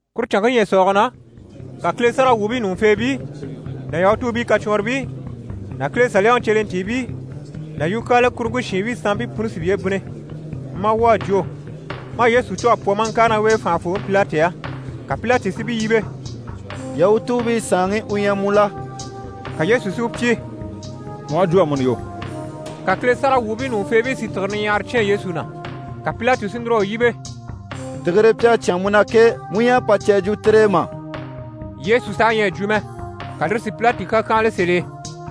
Kuru canŋke ɲyɛ̀sɔɔge na, ka Kile sáragawwuubii ɲùŋufeebii ná Yahutuubii kacwɔnribii ná Kile Saliyaŋi cyelentiibii ná yukyaala kuruŋke shiinbii sanmpii puni si piye bínni, maa wwɔ̀ a jwo, maa Yesu cû a pwɔ maa ŋkàre ná u e fànhafooŋi Pilati á. Ka Pilati si u yíbe: «Yahutuubii Saanŋi u ɲyɛ mu la?» Ka Yesu si u pyi: «Mu aha jwo amuni yo.» Ka Kile sáragawwuubii ɲùŋufeebii si tìgire niɲyahara cyán Yesu na. Ka Pilati si núr'a u yíbe: «Tìgire pi à cyán mu na ke, mu ɲyɛ a pà cè a jwo tire e mà?» Yesu saha ɲyɛ a jwo mɛ. Ka lire si Pilati kàkyanhala sèl'e.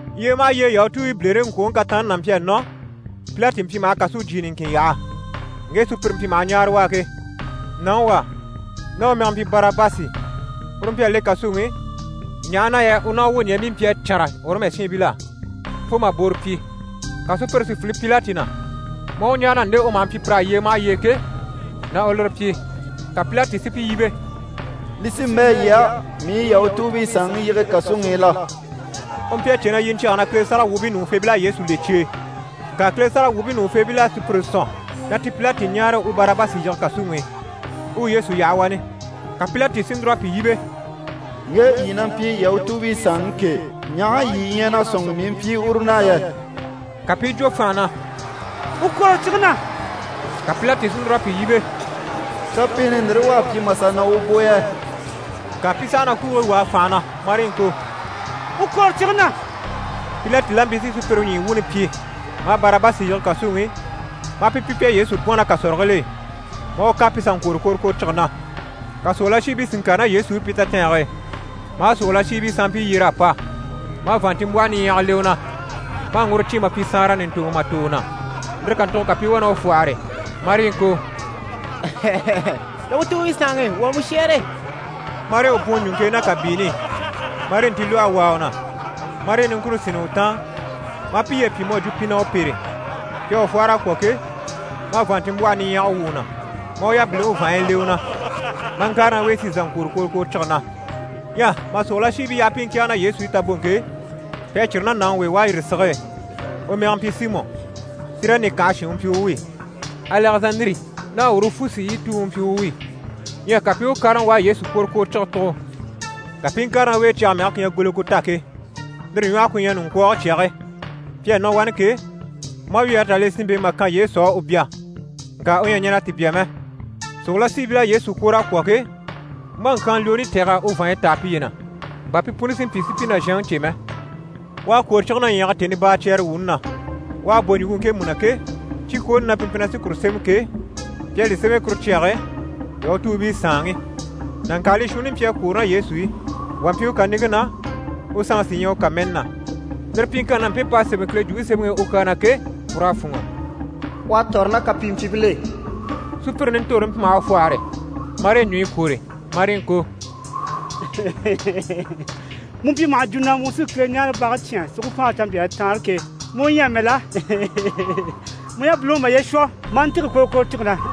Yyee maha yyee Yahutuubii bilereŋkwoŋi kataanni n'a mpyi a nɔ, Pilati mpyi maha kàsujyi niŋkin yaha, ŋge sùpyire mpyi maha ɲáare u á ke. Nàŋi wà, ná u mɛge na mpyi Barabasi, uru mpyi a le kàsuŋi i, ɲaha na yɛ u ná u wwoɲɛɛbii mpyi a cânra Ɔrɔmu shiinbil'á, fo mà booro pyi. Ka sùpyire si file Pilati na, maa u ɲáare na nde u maha mpyi pir'á yyee maha yyee ke, na u lire pyi. Ka Pilati si pi yíbe: «Li sí n‑bɛ̂ yii á, mii u Yahutuubii Saanŋi yige kàsuŋi i la?» U mpyi a cè na yiɲcyɛge na Kile sáragawwuubii ɲùŋufeebil'à Yesu le cye e. Ŋka Kile sáragawwuubii ɲùŋufeebil'à sùpyire sɔ̀n na ti Pilati ɲáare u Barabasi yige kàsuŋi i, u u Yesu yaha wani. Ka Pilati si núr'a pi yíbe: «Ŋge yii na mpyi Yahutuubii Saanŋi ke, ɲaha yii ɲyɛ na sɔ̂nŋi mii i mpyi uru na yɛ?» Ka pi i jwo fànha na: «U kwòro cige na!» Ka Pilati si núr'a pi yíbe: «Kapiini ndire u à pyi mà sà nɔ u bò yɛ?» Ŋka pi saha na kwuugii wàa fànha na, marii ŋko: «U kwòro cige na!» Pilati la mpyi si sùpyire ɲyii wuuni pyi, maa Barabasi yige kàsuŋi i, maa pi pyi pi à Yesu bwɔ̀n ná kàsɔrigil'e, maa u kan pi sà ŋkwòro kworokworocige na. Ka sòrolashiibii si ŋkàre ná Yesu i pi tatɛɛnge e, maa sòrolashiibii sanmpii yyer'a pa, maa vàanntinmbwɔhɔ niɲyɛga le u na, maa ŋguro cîn mà pyi saanra ɲùntoŋɔ mà tò u na. Lire kàntugo ka pi i wá na u fwɔ́hɔre, marii ŋko: «Yahutuubii Saanŋi, wuu à mu shɛ́ɛre!» Marii u bwùun ɲùŋke e ná kàbiini i, marii ntilwɔhe wàa u na, marii niŋkure sínni u taan, maa piye pyi mu à jwo pi na u pêre. Pi à u fwɔ́hɔr'a kwɔ̀ ke, maa vàanntinmbwɔhe niɲyɛge wwû u na, maa u yabiliŋi vàanɲyi le u na, maa ŋkàre ná u e si sà ŋkwòro kworokworocige na. Ɲyɛ mà sòrolashiibii yaha pi i ŋkɛ̀ɛge ná Yesu i taboŋke e, pi à círi ná nàŋi w'e u à yîri sige e, u mɛge mpyi Simɔ, Sirɛni kànhe shin u mpyi u wi. Alɛzandiri ná Urufusi yii tuŋi u mpyi u wi. Ɲyɛ ka pi i u kárama u à Yesu kworokworocige tugo. Ka pi i ŋkàre ná u e cyage mɛge ku ɲyɛ Gɔlikota ke, lire ɲwɔhe ku ɲyɛ: «Ɲuŋkwɔɔge Cyage.» Pi à nɔ wani ke, maa wyɛɛre tà le sinmpe e mà kan Yesu á u bya, ŋka u ɲyɛ a ɲɛn'a ti bya mɛ. Sòrolashiibil'à Yesu kwòr'a kwɔ̀ ke, maa ŋkyaanlwooni tɛ̀g'a u vàanɲyi táa piye na, bà pi puni si mpyi si pi nàzhanŋi cè mɛ. U à kwòro cige na ɲyɛ̀ge tèni baacyɛɛre wuuni na. U à bò ɲùŋke ŋkemu na ke, cikwooni na pi mpyi na sí kuru sémɛ ke, pi à li sémɛ kuru cyage e: «YAHUTUUBII SAANŊI». Nàŋkaalii shuunni mpyi a kwòro ná Yesu i. Wà mpyi u kàniŋke na, u sanŋi sí ɲyɛ u kàmɛni na. [ Lire pyiŋkanni na, mpe p'à sémɛ Kile Jwumpe Semɛŋi i u kyaa na ke, pur'à fûnŋɔ: «U à tɔ̀rɔ ná kapimpyiibil'e.»] Sùpyire nintorore mpyi maha u fwɔ́hɔre, marii ɲùɲyi kwòre, marii ŋko: «Mu u mpyi maha jwo na mu sí Kileɲaarebage cyán si ku faanre canmpyaa taanre e ke, mu u ɲyɛ amɛ la? Mu yabiliŋi u maye shwɔ, maa ntîge kworokworocige na.»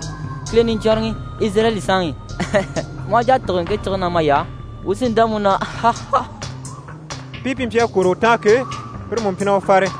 Kile Niɲcwɔnrɔŋi! Izirayɛli Saanŋi! Mu aha jà a tîge ŋke cige na may'á, wuu sí n‑dá mu na!» Mpii pi mpyi a kwòro u taan ke, pire mú mpyi na u fare.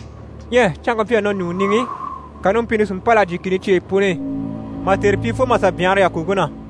Ɲyɛ canŋke mpyi a nɔ ɲùŋɔ niŋi i, ka numpini si mpâl'a jyè kìni cyeyi puni i, mà tère pyi fo mà sà byanhara yàkoŋke na.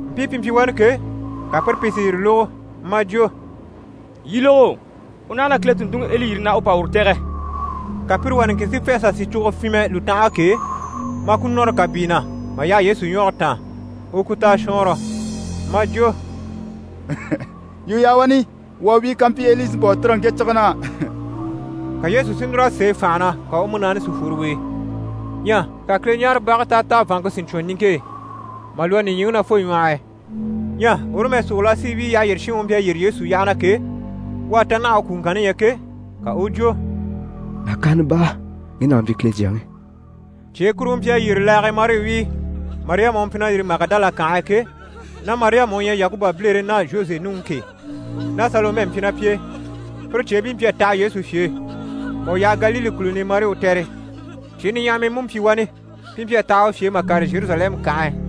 Mpii pi mpyi wani ke, ka pire pìi si yire lógo, maa jwo: «Yii lógo! U naha na Kile tùnntunŋiEli yiri na u pa uru tɛ̀gɛ.» Ka pire wà niŋkin si fê a sà sìcogo fyinmɛ lùtanhage k'e, maa ku nɔ́rɔ kàbii na, mà yaha Yesu ɲwɔge taan, u u ku ta a shwɔɔnrɔ. Maa jwo: «Yii u yaha wani, wuu a wíi kampyi Eli sí n‑pa u tîrige ŋke cige na.» Ka Yesu si núr'a sêe fànha na, ka u múnaani si fworo u e. Ɲyɛ ka Kileɲaarebage táataa vàanŋke si ɲcwɔn niŋke e, mà lwɔ́ nìɲyiŋi na fo ɲwɔh'i. Ɲyɛ Ɔrɔmu sòrolashiibii yyaha yyére shinŋi u mpyi a yyére Yesu yyaha na ke, u à ta naha u kwùŋkanni ɲya ke, ka u u jwo: «Nàkaana baa, ŋge nàŋi mpyi Kile Jyaŋi.» Cyee kuruŋɔ mpyi a yyére laage e, marii wíi. Mariyama u mpyi na yîri Magidala kànhe e ke, ná Mariyama, u ɲyɛ Yakuba bilere ná Zhoze nuŋi ke, ná Salomɛ mpyi pi e. Pire cyeebii pi mpyi a taha Yesu fye e mà u yaha Galile kùluni i marii u tɛ̀re. Cyee niɲyahamii mú mpyi wani, pi mpyi a taha u fye e mà kàre Zheruzalɛmu kànhe e.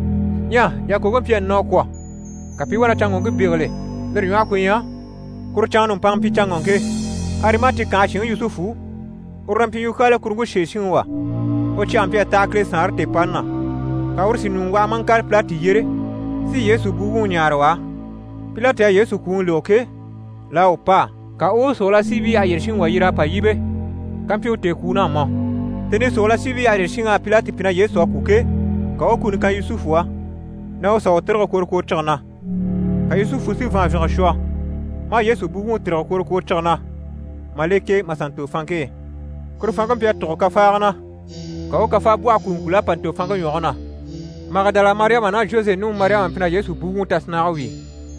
Ɲyɛ yàkoŋke mpyi a nɔ a kwɔ̀, ka pi i wá na canŋɔŋke bégeli, lire ɲwɔhe ku ɲyɛ: kuru canŋa nùmpanŋa mpyi canŋɔŋke. Arimati kànhe shinŋi Yusufu, uru na mpyi yukyaala kuruŋke sèe shinŋi wà. U cyɛge mpyi a taha Kile Saanre tèepani na. Ka uru si ɲùŋɔ waha maa ŋkàre Pilati yyére si Yesu buwuŋi ɲáare u á. Pilati à Yesu kwùŋi lógo ke, l'à u pâa, ka u u sòrolashiibii yyaha yyére shinŋi yyer'a pa yíbe kampyi u tèekwuun'à mɔ. Tèni i sòrolashiibii yyaha yyére shinŋ'à Pilati pyi na Yesu à kwû ke, ka u u kuni kan Yusufu á na u sà u tîrige kworokworocige na. Ka Yusufu si vàanvyinge shwɔ, maa Yesu buwuŋi tîrige kworokworocige na, mà le k'e, mà sà ntò fanŋke e. Kuru fanŋke mpyi a tùgo kafaaga na. Ka u u kafaabwɔhɔ kùuŋkul'à pa ntò fanŋke ɲwɔge na. Magidala Mariyama ná Zhoze nuŋi Mariyama mpyi na Yesu buwuŋi tasinnage wíi.